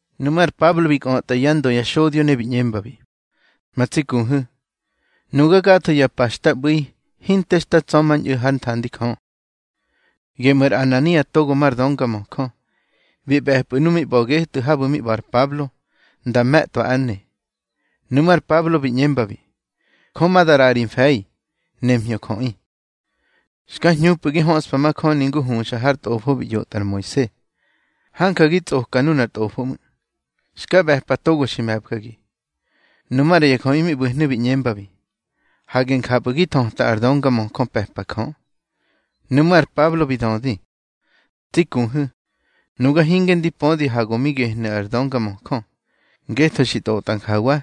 Nuꞌmú̱ ar Pablo bi kꞌötꞌa yá ndö ya xodyo, ne bi ꞌñembabi: —Ma tsi kuhu̱, nuga gatho ya pa xta ꞌbu̱i hinte xta tsa̱mañꞌu̱ hár nthandi Jö. Geꞌmú̱ ar Anania togo mar döngamöjö, bi ꞌbe̱pa nuꞌu̱ mi ꞌba̱ getꞌu̱ habu̱ mi ꞌba̱ ar Pablo nda me̱tꞌwa ár ne. Nuꞌmú̱ ar Pablo bi ꞌñembabi: —Jö ma da ꞌraꞌa ri mfe̱i, nemhñö jöꞌi. Xka hñupꞌu̱ gi hñöska majöni ngu huxa har tꞌofo bi ꞌyotꞌa ar Moise. Hanja gi tsꞌoka nunar tꞌofo ꞌmu̱, xka ꞌbe̱pa togo xi me̱bgagi. Nu maꞌra ya jöꞌi mi ꞌbu̱hnu̱ bi ꞌñembabi: —Hage njapꞌu̱ gi thöta ar döngamöjö pe̱pa Jö. Nuꞌmú̱ ar Pablo bi dödi: —Tsi kuhu̱, nuga hinge ndi pödi ha go mi gehnu̱ ar döngamöjö, ngetho xi tꞌotꞌa njawa: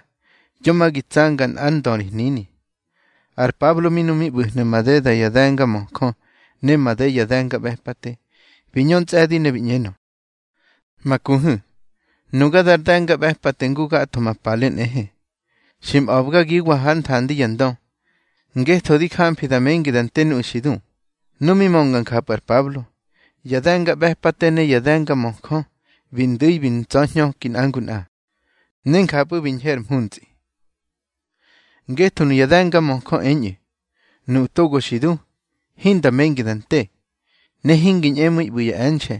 Yo ma gi tsanga nꞌár ndö ri hnini. Ar Pablo mi nu mi ꞌbu̱hnu̱ made ya de̱ngamöjö ne made ya de̱ngaꞌbe̱pate, bi ñö ntsꞌe̱di ne bi ꞌñenö: —Ma kuhu̱, nuga dar de̱ngaꞌbe̱pate ngu gatho ma pale nꞌehe. Xi mꞌa̱bgagiwa hár nthandi ya ndö, ngetho di jamfi da mengi da nte nuꞌu̱ xi du. Nu mi mönga njapꞌu̱ ar Pablo, ya de̱ngaꞌbe̱pate ne ya de̱ngamöjö bi ndu̱i bi ntsa̱hñöki nꞌa ngu nꞌa, ne njapꞌu̱ bi ñhe ar mhuntsꞌi. Ngetho nuya de̱ngamöjö eñꞌu̱, nuꞌu̱ togo xi du, hinda mengi da nte, ne hingi ñꞌemu̱iꞌu̱ ꞌbu̱ ya e̱nxe̱,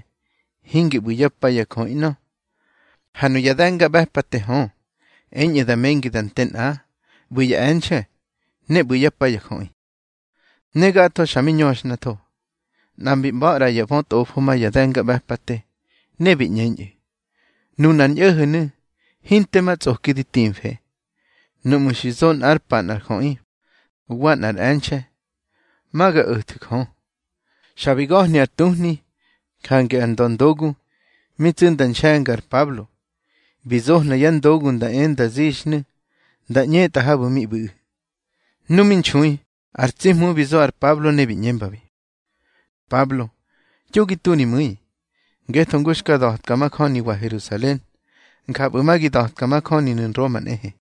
hingi ꞌbu̱ yá pa ya jöꞌi ꞌnö. Ha nuya de̱ngaꞌbe̱pate hö, eñꞌu̱ da mengi da nte nꞌa, ꞌbu̱ ya e̱nxe̱, ne ꞌbu̱ yá pa ya jöꞌi. Ne gatho xa mi ñöxhnatho. Nꞌa mbi mꞌa̱ ꞌra ya bötꞌofo ma ya de̱ngaꞌbe̱pate, ne bi ꞌñeñꞌu̱: —Nunar ñꞌo̱ho̱nu̱ hinte ma tsꞌoki di timfe. Nuꞌmu̱ xi zo nꞌár pa nꞌar jöꞌi, wa nꞌar e̱nxe̱, ma ga o̱thu̱ Jö. Xa bi ga̱hni ar tuhni. Jange ar ndöndogu, mi tsu nda nxe̱nga ar Pablo, bi zohna yá ndogu nda e nda zixnu̱ nda ꞌñetꞌa habu̱ mi ꞌbu̱ꞌu̱. Nu mi nxui ar tsi Hmu bi zo ar Pablo ne bi ꞌñembabi: —Pablo, yo gi tu ri mu̱i, ngetho ngu xka da̱tka majöniwa Herusalen, njapꞌu̱ ma gi da̱tka majöninu̱ Nroma nꞌehe.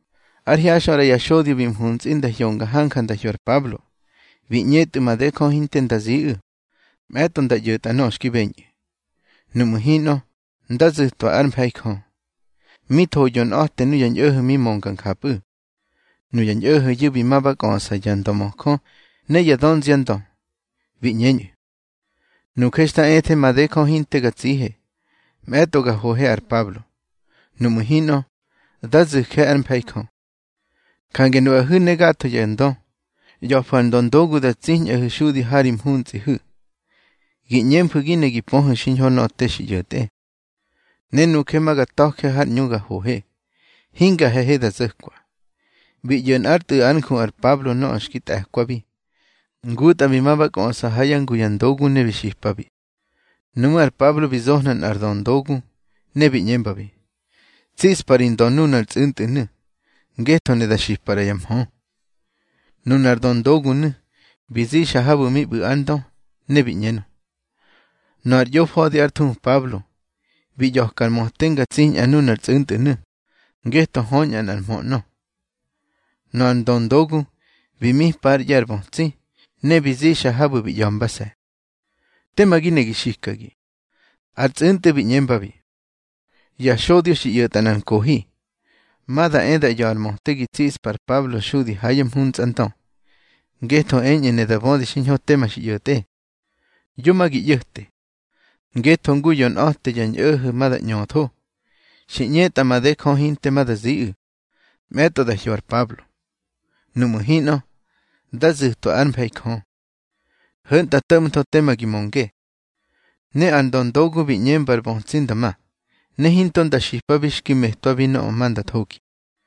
Ár hyaxꞌö ꞌra ya xodyo bi mhuntsꞌi nda hyonga hanja nda hyo ar Pablo. Bi ꞌñetꞌu̱ made Jö hinte nda ziꞌu̱, mꞌe̱tꞌo nda ꞌyo̱tꞌa nöꞌö xki beñꞌu̱. Nuꞌmu̱ hinꞌö, ndá zu̱twa ár mfe̱i Jö. Mi tho yonꞌa̱te nuya ñꞌo̱ho̱ mi mönga njapꞌu̱. Nuya ñꞌo̱ho̱yu̱ bi ma ba kꞌöꞌsa ya ndömöjö ne ya dönziandö, bi ꞌñeñꞌu̱: —Nuje xta ethe made Jö hinte ga tsihe, mꞌe̱tꞌo ga hohe ar Pablo. Nuꞌmu̱ hinꞌö, dá zu̱je ár mfe̱i Jö. Jange nuꞌahu̱ ne gatho ya ndö, ꞌya̱fu̱ ar ndöndogu da tsiñꞌahu̱ xudi ha ri mhuntsꞌihu̱. Gi ꞌñemfu̱ gi ne gi pöhu̱ xiñho nöꞌö te xi ꞌyo̱tꞌe. Ne nuje ma ga ta̱je har ꞌñu ga hohe, hinga he̱he da zo̱kwa. Bi ꞌyo̱ nꞌár tꞌu̱ ár nju ar Pablo nöꞌö xki tꞌe̱kwabi. Ngutꞌa bi ma ba kꞌöꞌsa ha yá ngu ya ndogu ne bi xipabi. Nuꞌmú̱ ar Pablo bi zohna nꞌar döndogu, ne bi ꞌñembabi: —Tsiꞌspa ri ndö nunar tsꞌu̱ntꞌu̱nu̱, ngetho ne da xipa ꞌra ya mhö. Nunar döndogunu̱ bi zixa habu̱ mi ꞌbu̱ ár ndö, ne bi ꞌñenö: —Nöꞌö ar ꞌyofa̱di ár thuhu Pablo, bi ꞌya̱ka ar möte nga tsiñꞌa nunar tsꞌu̱ntꞌu̱nu̱, ngetho höñꞌa nꞌar mhö ꞌnö. Nöꞌö ar ndöndogu bi mipa ár ꞌye̱ ar bötsi, ne bi zixa habu̱ bi ꞌya̱mbase̱: —Tema gi ne gi xikagi. Ar tsꞌu̱ntꞌu̱ bi ꞌñembabi: —Ya xodyo xi ꞌyo̱tꞌa nꞌar nkohi, ma da e da ꞌya̱ꞌa ar möte gi tsiꞌspa ar Pablo xudi ha yá mhuntsꞌandö, ngetho eñꞌu̱ ne da bödi xiñho tema xi ꞌyo̱tꞌe. Yo ma gi ꞌyo̱te, ngetho ngu yonꞌa̱te ya ñꞌo̱ho̱ ma da ꞌñöthó. Xi ꞌñetꞌa made Jö hinte ma da ziꞌu̱, mꞌe̱tꞌo da hyo ar Pablo. Nuꞌmu̱ hinꞌö, dá zu̱twa ár mfe̱i Jö. Ho̱ntꞌa to̱ꞌmatho tema gi mönge. Ne ar ndöndogu bi ꞌñemba ar bötsi nda ma, ne hinto nda xipabi xki metwabi nöꞌö ma nda thogi.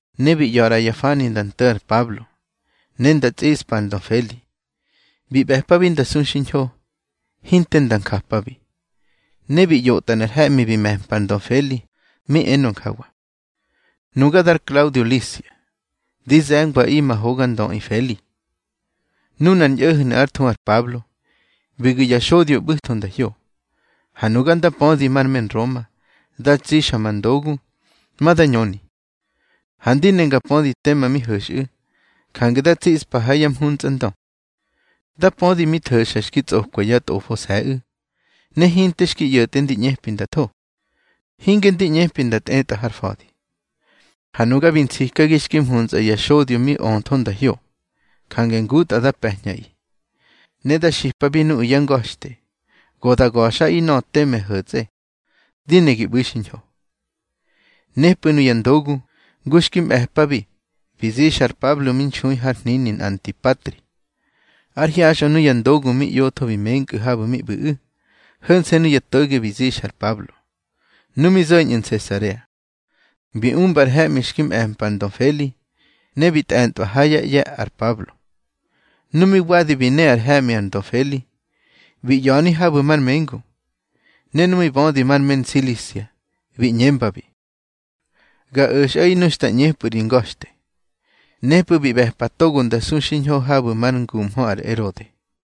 Ne bi ꞌya̱ ꞌra ya fani nda nto̱ ar Pablo, ne nda tsꞌiꞌspa ar ndö Feli. Bi ꞌbe̱pabi nda su xiñho, hinte nda njapabi. Ne bi ꞌyotꞌa nꞌar he̱ꞌmi bi me̱mpa ar ndö Feli, mi enö njawa: Nuga dar Klaudio Lisia, di ze̱ngwaꞌi ma hoga ndöꞌi Feli. Nunar ñꞌo̱ho̱nu̱ ár thuhu ar Pablo, bi gu̱ ya xodyo ꞌbu̱tho nda hyo. Ha nuga nda pödi mar me Nroma, da tsixa ma ndogu, ma da ñöni. Ha ndi ne nga pödi tema mi ho̱xꞌu̱, jange da tsiꞌspa ha yá mhuntsꞌandö. Da pödi mi tho̱xa xki tsꞌokwa yá tꞌofose̱ꞌu̱, ha hinte xki ꞌyo̱tꞌe ndi ꞌñepi nda tho, hinge ndi ꞌñepi nda tꞌetꞌa har fa̱di. Ha nuga bi nsikagi xki mhuntsꞌa ya xodyo mi öthó nda hyo. Jange ngutꞌa dá pe̱ñꞌaꞌi, ne da xipabi nuꞌu̱ yá nga̱xte, go da ga̱xꞌaꞌi nöꞌö teme ho̱tsꞌe. Di ne gi ꞌbu̱i xiñho. Nepꞌu̱ nuya ndogu, ngu xki mꞌe̱pabi, bi zixa ar Pablo mi nxui har hnini Antipatri. Ár hyaxꞌö nuya ndogu mi ꞌyotho bi menkꞌu̱ habu̱ mi ꞌbu̱ꞌu̱. Ho̱nse̱ nuya to̱ge bi zixa ar Pablo. Nu mi zo̱ñꞌu̱ Nsesarea, bi umba ar he̱ꞌmi xki mꞌe̱mpa ar ndö Feli, ne bi tꞌentꞌwa ha yá ꞌye̱ ar Pablo. Nu mi wadi bi ne ar he̱ꞌmi ar ndö Feli, bi ꞌya̱ni habu̱ mar mengu. Ne nu mi bödi mar me Nsilisia, bi ꞌñembabi: —Ga o̱xꞌaꞌi nu xta ꞌñepꞌu̱ ri nga̱xte. Nepꞌu̱ bi ꞌbe̱pa togo nda su xiñho habu̱ mar nguhmö ar Erode.